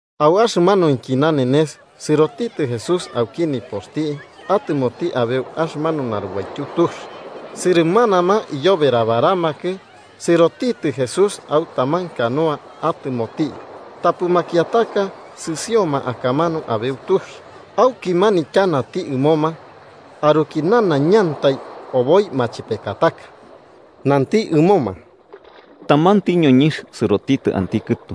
Au axɨmanuinki nanenes sɨrotitɨ Jesús auki nipoxti atɨmoti abeu axɨmanu narubaityu tux. Sɨrɨmanama iyoberabaramakɨ, sɨrotitɨ Jesús au taman canoa atɨmoti, tapɨ makiataka sɨsioma akamanu abeu tux. Auki manityanati ɨmoma aruki nanaiñantai oboi machepekataka. Nanti ɨmoma: “Tamanti ñoñɨnx sɨrotitɨ anti kɨtu.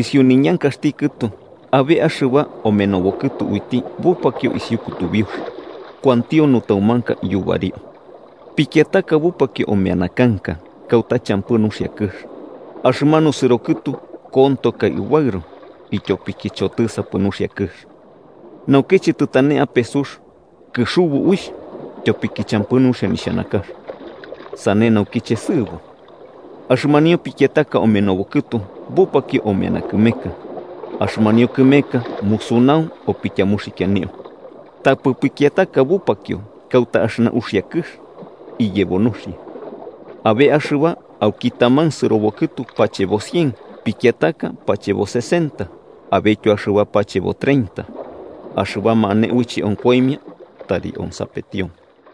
Isiu niñankaxti kɨtu, abe axɨba omenobokɨtu uiti bupakio isiu kutubiux, kuantio nutaumanka yubario. Pikiataka bupakio omeana kanka, kauta champɨ nuxia kɨx. Axɨmanu sɨro kɨtu kontokai ubaɨro, ityopiki chotɨsapɨ nuxia kɨx. Naukiche tɨtane ape sux, kɨxubu uixh, tyopiki champɨ nuxia nixhanakax, sane naukiche sɨɨbo. Axɨmanio pikiataka omenobo kɨtu bupakio omeana kɨmeka, axɨmanio kɨmeka musunau opityamuxikianio. Tapɨ pikiataka bupakio kauta axɨna uxia kɨx, iyebo nuxia. Abe axɨba auki taman sɨrokɨtu pachebo cien. Pikiataka pachebo sesenta, abetyo axɨba pachebo treinta. Axɨbama ane uiche onkoimia, tari onsapetioma.”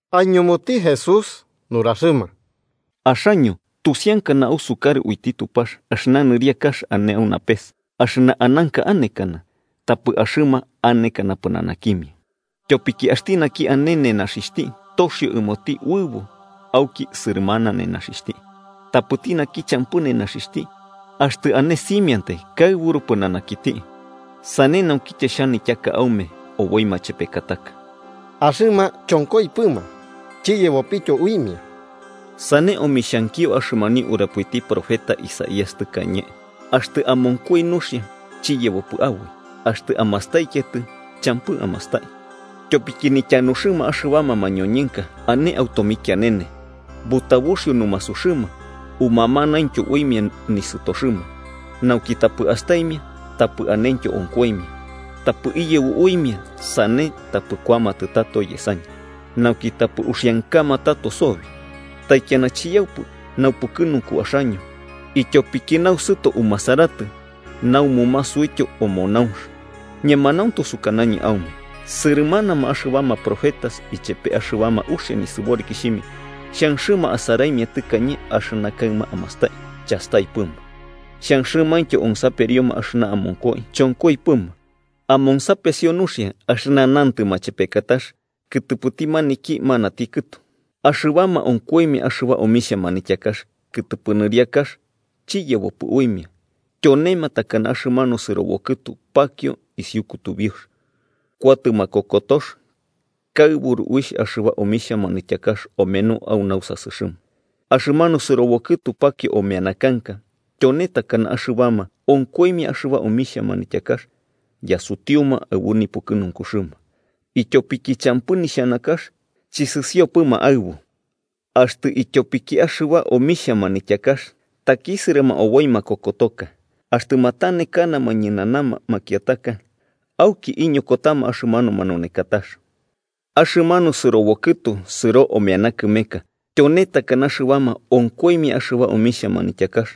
Aiñumuti Jesús nuraxɨma: “Axaño, tusiankana ausukarɨ uiti Tupax, axɨna nɨriakax ane au napes axɨna ananka anekana, tapɨ axɨma anekana pɨnanakimia. Tyopiki axti naki ane nenaxixhti, toxio ɨmoti uɨbo auki sɨrɨmana nenaxixhti. Tapɨti naki champɨ nenaxixhti, axtɨ ane simiantai kaɨburu pɨnanakiti. Sane naukiche xhanityaka aume oboi machepekataka. Axɨma chonkoipɨma chiyebopityo uimia. Sane, omixhankio axɨmanio urapoiti profeta Isaías tɨkañe: ‘Axtɨ amonkoi nuxia, chiyebopɨ aboi, axtɨ amastaikiatɨ, champɨ amastai. Tyopiki nityanuxɨma axɨbama mañoñɨnka ane au tomikianene, butabuxio numasuxɨma umamanaintyo uimia nisɨtoxɨma, nauki tapɨ astaimia tapɨ anentyo onkoimia, tapɨ iyebo uimia sane tapɨ kuamatɨ tato yesañɨ, nauki tapɨ uxiankama tato sobi.’ “Taikiana chiyaupɨ naupukɨnunku axaño, ityopiki nausɨto umasaratɨ namumasuityo omonaunx. Ñemanauntu sukanañɨ aume sɨrɨmanama axɨbama profetas ichepe axɨbama uxia nisɨborikixhimia xhanxɨma asaraimia tɨkañe axɨna kaɨma amastai, chastaipɨma. Xhanxɨmaintyo onsaperioma axɨna amonkoi, chonkoipɨma. “Amonsapesio nuxia, axɨna nantɨ machepekatax kɨtɨpɨti maniki manati kɨtu: Axɨbama onkoimia axɨba omixhia manityakax kɨtɨpɨ nɨriakax chiyebopɨ uimia, tyonema takana axɨmanu sɨrobo kɨtu pakio isiu kutubiux. Kuatɨ makokotox kaɨburu uixh axɨba omixhia manityakax omeno au nausasɨxɨma. Axɨmanu sɨrobo kɨtu pakio omeana kanka tyone takana axɨbama onkoimia axɨba omixhia manityakax yasutiuma aɨbu nipukɨnunkuxɨma, ityopiki champɨ nixhanakax, chɨsɨsiopɨma aɨbu. Axtɨ ityopiki axɨba omixhia manityakax takisɨrɨma oboi makokotox, axtɨ matanekanama ñɨnana makiataka, auki iñokotama axɨmanu manunekatax. Axɨmanu sɨrobo kɨtu sɨro omeana kɨmeka tyone takana axɨbama onkoimia axɨba omixhia manityakax,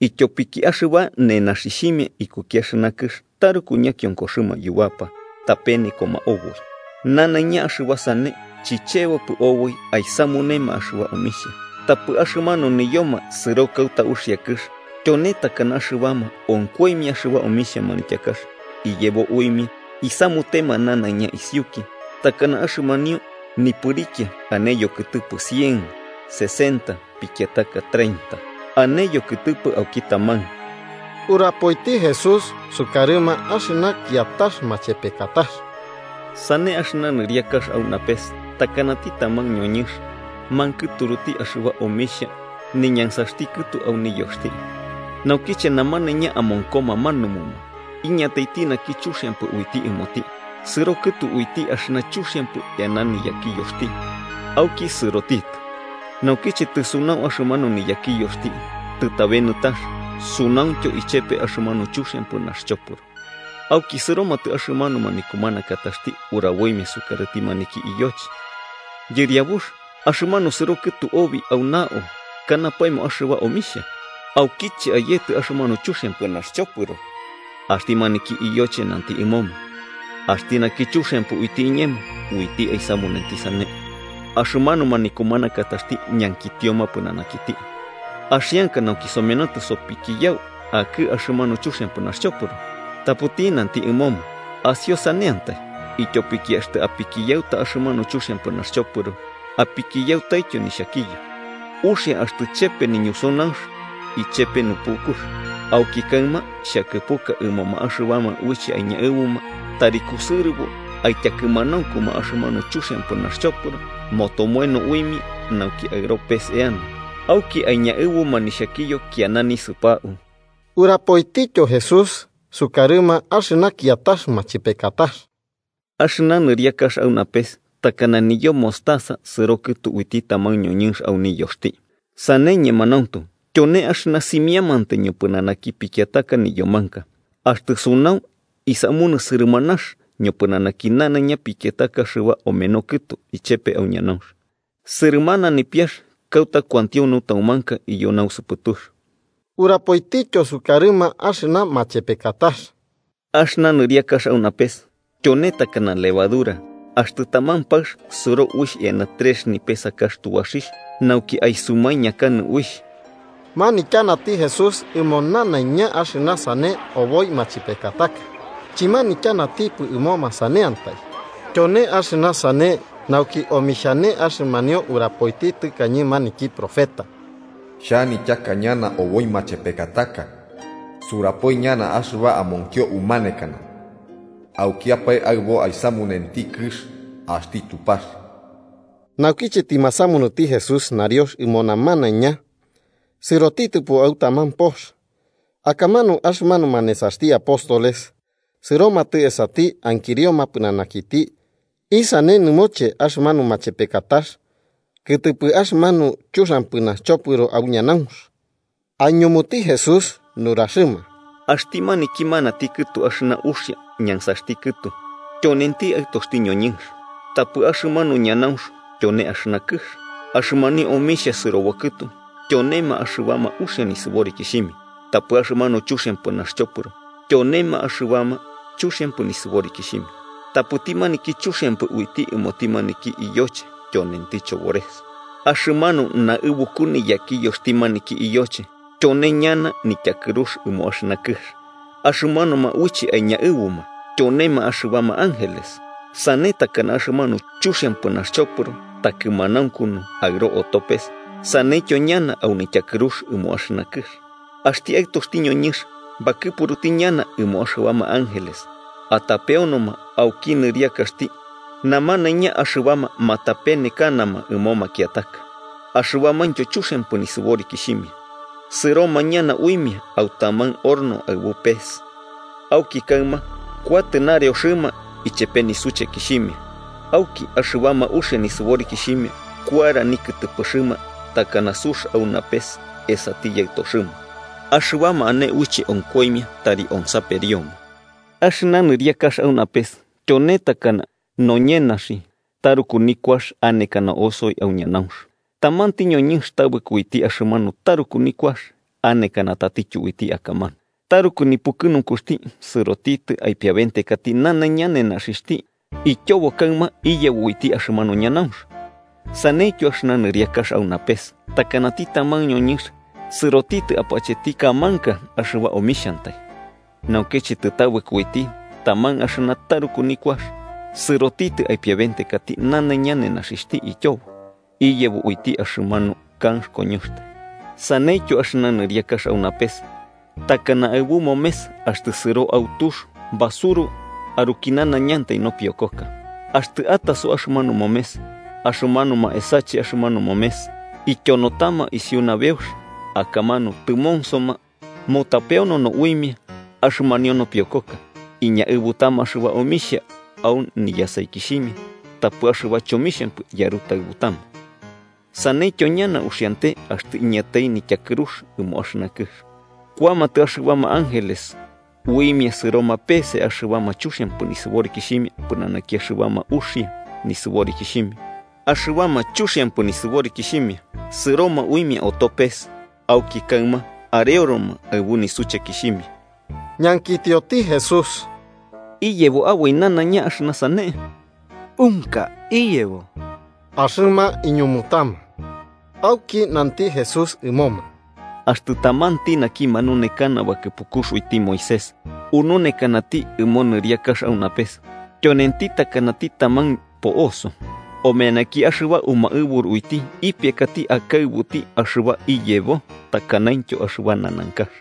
ityopiki axɨba nenaxixhimia ikuki axɨna kɨx taruku ñakionkoxɨma yubapa tapenekoma oboi. Nanaiña axɨba sane chichebopɨ oboi aisamunema axɨba omixhia. Tapɨ axɨmanu niyoma sɨro kauta uxia kɨx, tyone takana axɨbama onkoimia axɨba omixhia manityakax iyebo uimia isamutema nanaiña isiuki, takana axɨmanio nipɨrikia ane yokɨtɨpɨ cien, sesenta pikiataka treinta ane yokɨtɨpɨ auki taman.” Urapoiti Jesús sukarɨma axɨna kiatax machepekatax: “Sane axɨna nɨriakax au napes takanati taman ñoñɨnx mankɨturuti axɨba omixhia niñansaxti kɨtu au niyoxti. Naukiche namanaiña amonkoma manumuma, iñataiti naki chuxiampɨ uiti ɨmoti, sɨro kɨtu uiti axɨna chuxiampɨ eana niyakiyoxti auki sɨrotitɨ. Naukiche tɨsunau axɨmanu niyakiyoxti tɨtabe nɨtax, sunauntyo ichepe axɨmanu chuxiampɨ naxchopɨro. Auki sɨromatɨ axɨmanuma nikumanakataxti uraboimia sukarɨti maniki iyoche: ‘Yɨriabux, axɨmanu sɨro kɨtu obi au nao kanapaemo axɨba omixhia, ¿aukiche ayetɨ axɨmanu chuxiampɨ naxchopɨro?’ Axti maniki iyoche nanti ɨmoma: ‘Axti naki chuxiampɨ uiti iñemo uiti aisamunenti sane.’ Axɨmanuma nikumanakataxti ñankitioma pɨnanakiti: ‘¿Axianka nauki somenotɨ sopikiyau akɨ axɨmanu chuxiampɨ naxchopɨro?’ Tapɨti nanti ɨmoma: ‘Asiosaneantai, ityopiki axtɨ apikiyauta axɨmanu chuxiampɨ naxchopɨro apikiyautaityo nixhakiyo. Uxia axtɨ chepe niñusunaunx ichepe nupukux. Auki kaɨma xhakɨpuka ɨmoma axɨbama uiche aiñaɨbuma tari kusɨrɨbo aityakɨmanaunkuma axɨmanu chuxiampɨ naxchopɨro motomoeno uimia, nauki aɨro pes eana, auki aiñaɨbuma nixhakiyo kiana nisɨpau.’” Urapoitityo Jesús sukarɨma axɨna kiatax machepekatax: “Axɨna nɨriakax au napes takana niyo mostaza sɨro kɨtu uiti taman ñoñɨnx au niyoxti. Sane, ñemanauntu, tyone axɨna simiamantai ñopɨnanaki pikiataka niyomanka. Axtɨ sunau, isamunɨ sɨrɨmanax ñopɨnanaki nanaiña pikiataka axɨba omeno kɨtu ichepe au ñanaunx, sɨrɨmana nipiax kauta kuantio nutaumanka iyo nausɨpɨtux.” Urapoitityo sukarɨma axɨna machepekatax: “Axɨna nɨriakax au napes tyone takana levadura axtɨ taman paɨx sɨro uixh eana trex nipesakax tubaxixh nauki aisumaikianɨ uixh.” Manityanati Jesús ɨmo nanaiña axɨna sane oboi machepekataka, chɨmanityanatipɨ ɨmoma saneantai. Tyone axɨna sane nauki omixhane axɨmanio urapoiti tɨkañe maniki profeta: “Xhanityaka ñana oboi machepekataka. Surapoi ñana axɨba amonkio umanekana aukiapae aɨbo aisamunenti kɨx axti Tupax.” Naukiche tɨmasamunuti Jesús nariox ɨmo namanaiña sɨrotitɨpo au taman pox, akamanu axɨmanuma nesaxti apóstoles sɨromatɨ esati ankirioma pɨnanakiti isane nɨmoche axɨmanu machepekatax kɨtɨpɨ axɨmanu chuxiampɨ naxchopɨro au ñanaunx. Aiñumuti Jesús nuraxɨma: “Axti maniki manati kɨtu axɨna uxia ñansaxti kɨtu tyonenti Aɨtoxti ñoñɨnx, tapɨ axɨmanu ñanaunx tyone axɨna kɨx. Axɨmanio omixhia sɨrobo kɨtu tyonema axɨbama uxia nisɨborikixhimia, tapɨ axɨmanu chuxiampɨ naxchopɨro tyonema axɨbama chuxiampɨ nisɨborikixhimia, tapɨti maniki chuxiampɨ uiti ɨmoti maniki iyoche tyonenti chobores. Axɨmanu naɨbuku niyakiyoxti maniki iyoche tyone ñana nityakɨrux ɨmo axɨna kɨx, axɨmanuma uiche aiñaɨbuma tyonema axɨbama ángeles. Sane takana axɨmanu chuxiampɨ naxchopɨro takɨmanaunkunu aɨro oto pes, saneityo ñana au nityakɨrux ɨmo axɨna kɨx. Axti Aɨtoxti ñoñɨnx bakɨpuruti ñana ɨmo axɨbama ángeles atapeonoma auki nɨriakaxti namanaiña axɨbama matapenekanama ɨmo makiataka, axɨbamaintyo chuxiampɨ nisɨborikixhimia. Sɨroma ñana uimia au taman horno aɨbu pes, auki kaɨma kuatɨ nareoxɨma ichepe nisuchekixhimia. Auki axɨbama uxia nisɨborikixhimia kuara nikɨtɨpɨxɨma takana sux au napes esati Yaɨtoxɨma. Axɨbama ane uiche onkoimia, tari onsaperioma. “Axɨna nɨriakax au napes tyone takana noñenaxi taruku nikuax anekana osoi au ñanaunx, tamanti ñoñɨnx tabɨko uiti axɨmanu taruku nikuax, anekana tatityo uiti akamanu. Taruku nipukɨnunkuxti, sɨrotitɨ aipiabentekati nanaiña nenaxixhti, ityobo kaɨma iyebo uiti axɨmanu ñanaunx. “Saneityo axɨna nɨriakax au napes takanati taman ñoñɨnx sɨrotitɨ apacheti kamanka axɨba omixhantai. Naukiche tɨtabɨko uiti taman axɨna taruku nikuax, sɨrotitɨ aipiabentekati nanaiña nenaxixhti, ityobo iyebo uiti axɨmanu kanx koñoxtai. “Saneityo axɨna nɨriakax au napes takana aɨbu momes axtɨ sɨro au tux basuru aruki nanaiñantai nopiokoka. Axtɨ ataso axɨmanu momes, axɨmanuma esache axɨmanu momes ityonotama isiu nabeux, akamanu tɨmonsoma mutapeonono uimia axɨmanio nopiokoka. Iñaɨbutama axɨba omixhia au niyasaikixhimia tapɨ axɨba chomixhampɨ yarutaɨbutama. Saneityo ñana uxiante axtɨ iñatai nityakɨrux ɨmo axɨna kɨx: kuamatɨ axɨbama ángeles uimia sɨroma peese axɨbama chuxiampɨ nisɨborikixhimia pɨnanaki axɨbama uxia nisɨborikixhimia, axɨbama chuxiampɨ nisɨborikixhimia sɨroma uimia oto pes. Auki kaɨma areoroma aɨbu nisuchekixhimia.” Ñankitioti Jesús: –¿Iyebo aboi nanaiña axɨna sane? –Unka iyebo–axɨma iñumutama. Auki nanti Jesús ɨmoma: –Axtɨ tamanti naki manunekana bakɨpukux uiti Moisés ununekanati ɨmo nɨriakax au napes, tyonenti takanati taman po'oso, omeanaki axɨba umaɨburu uiti ipiakati akaɨbuti axɨba iyebo takanaintyo axɨba nanankax.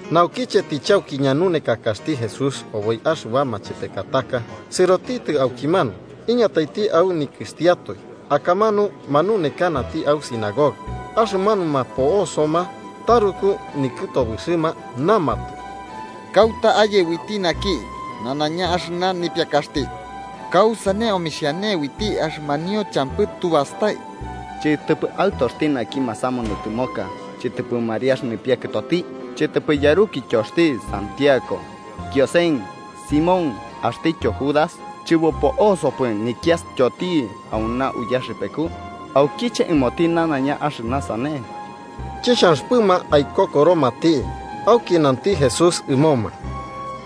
Naukiche tɨchauki ñanunekakaxti Jesús oboi axɨba machepekataka, sɨrotitɨ aukimanu iñataiti au nikɨxtiatoe, akamanu manunekanati au sinagoga. Axɨmanuma po'osoma, taruku nikɨtobɨxɨma, namatɨ: –¿Kauta aye uiti naki nanaiña axɨna nipiakaxti? ¿Kausane omixhane uiti axɨmanio champɨ tu bastai? ¿Chɨtɨpɨ aɨtoxti maniki masamunuti tɨmoka, chɨtɨpɨ Mariax nipiakɨtoti? ¿Chɨtɨpɨ axti yarukityoti Santiago, Kiosen, Simón axtityo Judas, chɨbopo'osopɨ nikiastyoti auna uyaxɨpeku? ¿Aukiche ɨmoti nanaiña axɨna sane? Chixhanxɨpɨma aikokoromati. Auki nanti Jesús ɨmoma: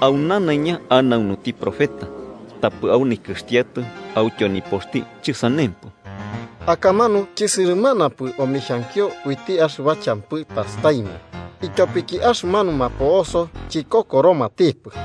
–Au nanaiña anaunuti profeta, tapɨ au nikɨxtiatoe autyo nipoxti chɨsanempɨ. Akamanu chɨsɨrɨmanapɨ omixhankio uiti axɨba champɨ tastaimia ityopiki axɨmanuma po'oso chikokoromatipɨ.